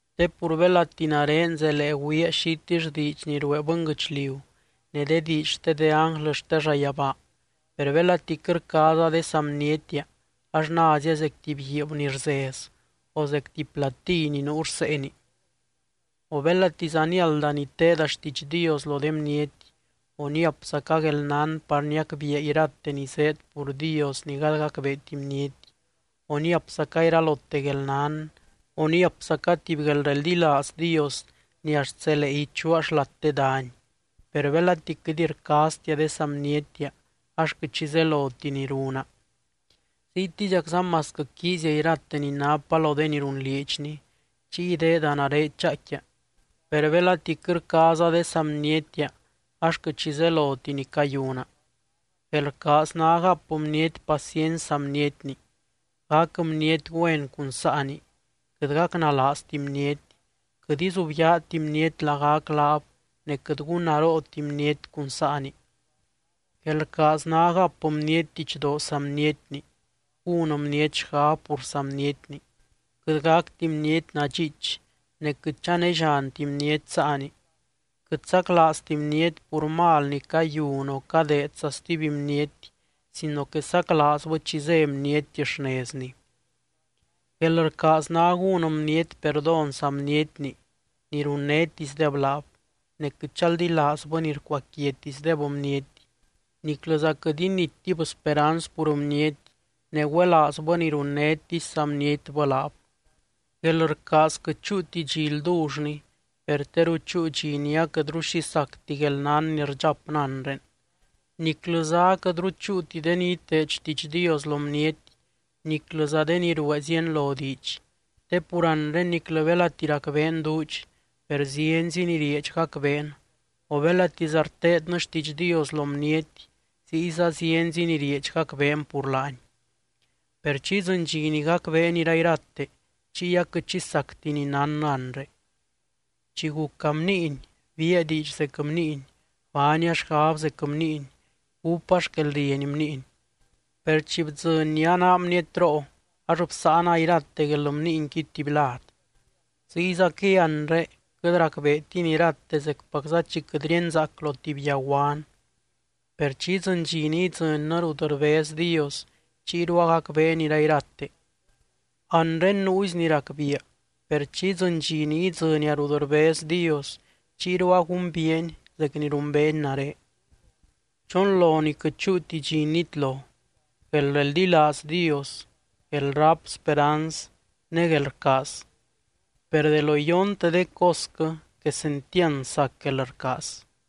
Te pur belati nare zelee güiia xitill diidx ni ruee bɨnguɨchliu ne de diidx xte de ánglɨ xte llayabaa, per belati quɨt rcaaza de saa bnietia ax názia zec tuby guiib ni rzez o zec tuby platíy ni nuu rseeni. O belatiza niálda niteeda xtiidx Dios lo de bniety, o niapzaca guelnán par niacbiia irate ni zéed pur Dios ni gady gacbeeti bniety, o niapzaca iralote guelnán, o niapzaca tuby guelreldilaaz Dios ni axt zelee ichuaa xlat de dany, per belati quɨt rcaaztia de saa bnietia ax quɨt xi zeloti ni runa. Ziytiziacza masquɨ quiizia irate ni napa lo de ni runlieedxni chiy ideeda nare chaaicquia, per belati quɨt rcaaza de saa bnietia ax quɨt xi zeloti ni cayuna. Guelrcaaz ná gap bniety paciency saa bnietni, gac bniety güen cun saani, quɨt gacnalaazti bniety, quɨt izubyaati bniety lagac laab ne quɨt gúnnarooti bniety cun saani. Guelrcaaz ná gap bniety didxdoo saa bnietni, gún bniety xgab pur saa bnietni, quɨt gacti bniety nadxiich, ne quɨt chanellianti bniety saani, quɨt saclaazti bniety pur mal ni cayun o cadeedza stuby bniety sino que saclaazbɨ chi zé bniety xnezni. Guelrcaaz ná gún bniety perdón saa bnietni ni runnétisdeb laab, ne quɨt chaldilaazbɨ ni rcuaquiatisdeb bniety niclɨza quɨt inittib speranz pur bniety ne güelaazbɨ ni runnétisy saa bnietbɨ laab. Guelrcaaz quɨt chúuti dxi ldullni, per teru chúu dxi ni aquɨtru xi sacti guelnán ni rdxapnɨ anre, niclɨza aquɨtru chúuti de ni iteed xtiidx Dios lo bniety niclɨza de ni ruee zienlo diidx. Te pur anre niclɨ belati racbeen duudx, per zienzi ni rieedx gacbeen o belatiza rteednɨ xtiidx Dios lo bniety ziyza zienzi ni rieedx gacbeen pur laany. Per chi idzɨny dxi ni gacbeen irairate, chiy aquɨt xi sacti ni nánnɨ anre. Chi guca bniiny biia diidx zec bniiny, baania xgab zec bniiny, gúpa xquelrieny bniiny. Per chi bdzɨny ni anaa bnietroo ax bsáana irate guelbniinqui tuby lad. Ziyzaquɨy anre quɨt racbeetin irate zecpacza chi quɨt ríenzaac lo tuby yaguan, per chi idzɨny dxi ni idzɨnnɨ rut rbez Dios chiyru agacbeen irairate. Anre nuuzi ni racbiia per chi idzɨny dxi ni idzɨnia rut rbez Dios chiyru agumbiiany zec ni rumbeeny nare. Chonlo ni quɨt chúuti dxi nitlo: Guelreldilaaz Dios, guelráp speranz ne guelrcaaz. Per de lo iyonte de cosquɨ quesentiand sac guelrcaaz.